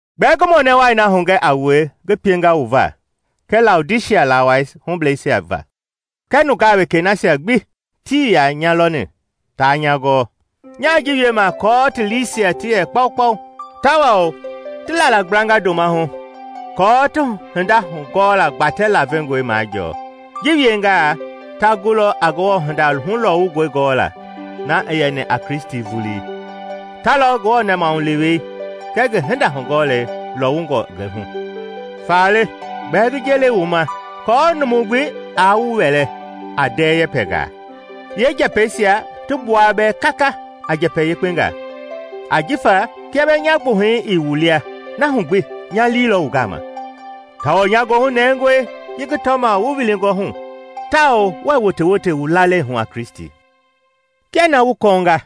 Gbɛɛ ngi mɔnɛ wai na hugɛ a wue ngi pienga wu va kɛɛ Laodisia lawai hubleisia va kɛɛ nungaa wekei nasia gbi tii yaa nya lɔni taa nya gɔɔ. Nyaa ji wiema kɔɔ ti liisia ti yɛ kpaukpau tawao ti lalagblanga ndoma hu aako ti hinda hugɔɔla gbatɛ lavengɔi majɔɔ. Ji wiengaa, ta gulɔ a Ngewɔ hinda hulɔwungɔi gɔla, na i yɛni a Kristi vulii. Ta lɔ Ngewɔ nɛmahulewei kɛɛ ngi hinda-hugɔlei lɔwungɔ ngi hu. Faale, gbɛɛ ngi ji le wu ma aako numu gbi aa wu wɛlɛ a ndɛɛ yɛpɛngaa, yeenjɛpɛisia ti gbua bɛɛ kaka a njɛpɛ yekpengaa. Ajifa kia bɛɛ nya gbuhɛi ii wu lia, na hu gbi nyalii lɔ wu gama, tawao nya goohu nɛngɔe ji ngi tɔma wu wilingɔ hu tawao wuɛɛ wotewote wu lalei hu a Kristi. Kia na wu kɔɔnga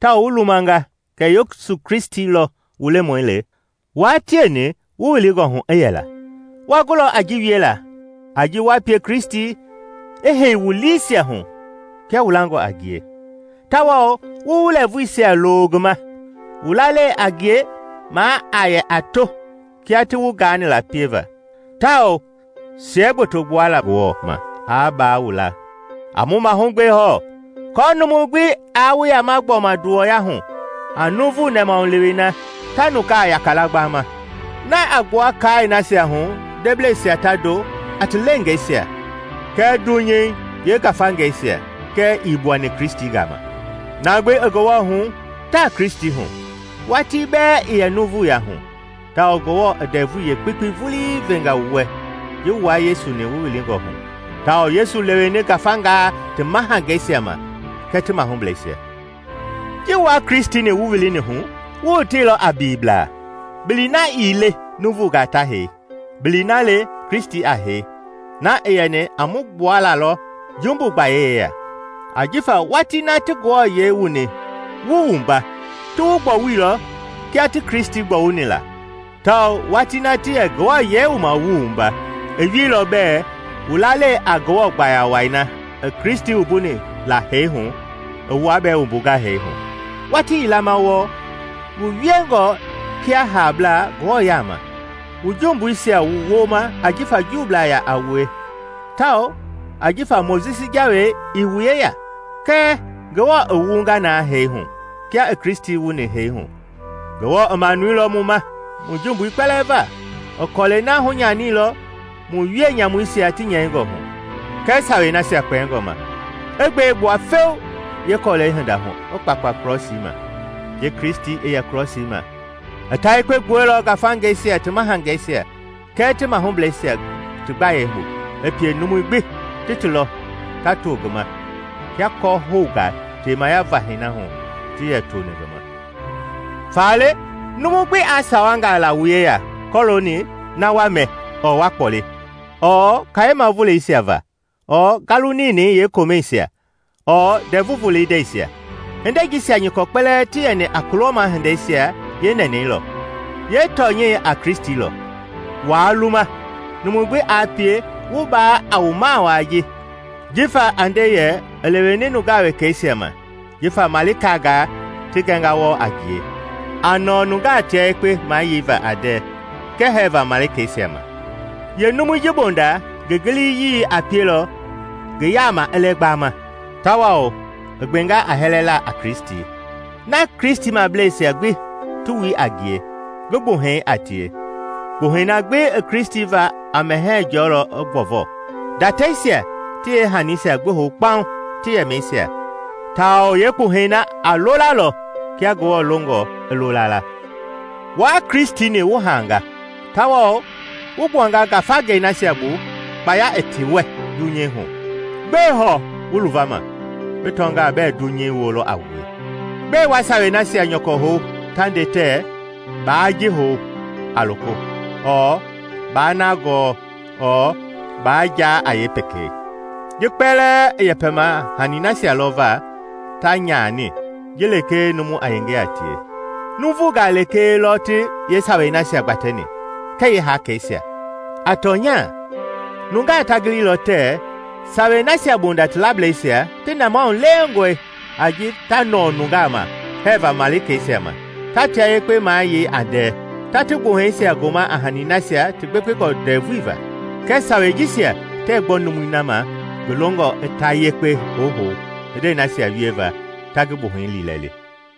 tao wu lumanga kɛ Yesu Kristi lɔ wu Lemɔi le, wua tieni wu wilingɔ hu i yɛla. Wa gulɔ a ji wiela a ji wa pie Kristi i hei wu liisia hu kia wu langɔ a ngie, tawao wu wu lɛɛvuisia loo ngi ma, wu lalei a ngie maa a yɛ a to, kia ti wu gaani la pieva. Tawao siɛgboto gbuala Ngewɔ ma aa baa wu la. A wu mahugbe hɔɔ, kɔɔ numu gbi aa wu yama gbɔma nduwɔya hu a nuuvu nɛmahulewei na ta nungaa yaka la gbama, na a gbua kaai nasia hu ndebleisia ta ndo a ti leengeisia kɛɛ dunyei yeengafangeisia, kɛɛ ii gbuani Kristi gama. Na gbi i Ngewɔ hu taa Kristi hu, watii bɛɛ i yɛ nuuvuya hu, tawao Ngewɔ i ndɛvui yeekpekpei vulii venga wu wɛ ji wua Yesu-ni wu wilingɔ hu, tawao Yesu leweni ngafangaa ti mahangeisia ma kɛɛ ti mahublɛisia. Ji wua Kristi-ni wu wilini hu, wu woteilɔ a biliblaa, bili na ii le nuuvungaa ta hei, bilii na le Kristi a hei, na i yɛni a mu gbualalɔ jumbu gbayei yeya. Ajifa watii na ti wu wuani, ti wu gbɔwuilɔ kia ti Kristi gbɔwuni la, tawao watii ti yɛ wu wuama i wieilɔ bɛɛ wu lalei a Ngewɔ gbaya wai na i Kristi wuni la hee hu i wua bɛɛ wumbunga hee hu. Watii yila ma wɔɔ wu wielɔ kia haablaa Ngewɔ yaama wu jumbuisia wooma ajifa Juublaa yaa a wue tawao jifa Mojisi Jawei ii wu yeya. Kɛɛ Ngewɔ i wu wunga na hee hu kia i Kristi wuni hee hu. Ngewɔ i manuilɔ mu ma mu jumbui kpɛlɛɛ va; i kɔlɛi na hunyaniilɔ mu wienyamuisia ti nyɛingɔ hu, kɛɛ Sawei nasia kpɛngɔ ma, i gbe gbua feu yeekɔlɛi hinda hu i kpakpa krɔsii ma. Ji Kristi i yɛ krɔsii ma, i ta yekpe gbuɛilɔ ngafangeisia ti mahangeisia kɛɛ ti mahublɛisia ti gbayei bu, i pie numui gbi ti ti lɔ ta to ngi ma kia kɔ-houngaa temaya vahɛi na hu ti yɛ tooni ngi ma. Faale, numu gbi aa sawangaa la wu yeya kɔlooni na wa mɛ ɔɔ wa kpɔli, ɔɔ Kayema voleisia va ɔɔ Ngalu Ninɛi yeekomɛisia ɔɔ Ndɛvu Volei ndɛisia. Hindei jisia nyɔkɔ kpɛlɛɛ ti yɛni a kulɔma hindeisia yeenɛnɛi lɔ; yeetɔnyɛi a Kristi lɔ. Waa luma numu gbi aa pie wu baa a wu mawaa jifa a nde yɛ i leweni nungaa wekeisia ma jifa malikangaa ti gɛnga wɔɔ a ngie, a nɔɔ nungaa tia yekpe mayeiva a ndɛɛ kɛɛ hɛɛva malikeisia ma. Yeenumui ji bonda ngi giliyii a pielɔ ngi yaama i lɛ gbama, tawao i gbenga a hɛlɛla a Kristi, na Kristimableisia gbi ti wui a ngie, ngi gbuhɛi a tie. Kpuhɛi na gbi i Kristi va a mɛhɛɛ jɔlɔ i gbɔvɔ, ndatɛisia ti yeehaniisia gbi hou kpaŋ ti yɛmɛisia, tawao yeekpuhɛi na a loolalɔ kia Ngewɔ longɔ i loola. Wua Kristi-ni wu haanga tawao wu gbuanga ngafangei nasia bu kpaya i ti wɛ dunyei hu. Gbɛe hɔɔ wu luvama bi tɔngaa bɛɛ dunyei ji woo lɔ a wue? Gbɛe wa sawei nasia nyɔkɔ hou ta nde tɛɛ, “Baa ji hou a loko, ɔɔ Baa na gɔɔ, ɔɔ Baa jaa a yeepekei?” Ji kpɛlɛɛ i yɛpɛma hanii nasia lɔ va ta nyani ji lekee numu a yenge a tie; nuuvunga lekee lɔ ti yeesawei nasia gbatɛni kɛɛ yeekaaisia. A tɔnya nungaa ta gililɔ tɛɛ sawei nasia bonda ti lablɛisia ti nɛmahu lewengɔe a ji ta nɔɔ nungaa ma hɛɛva malikeisia ma, ta tia yekpe mayei a ndɛɛ, ta ti gbuhɛisia goma a hanii nasia ti gbekpengɔ ndɛvui va; kɛɛ sawei jisia tɛɛ gbɔ numui na ma ngi longɔ i ta yekpe huhou hindei nasia wieva ta ngi gbuhɛi liilɛli.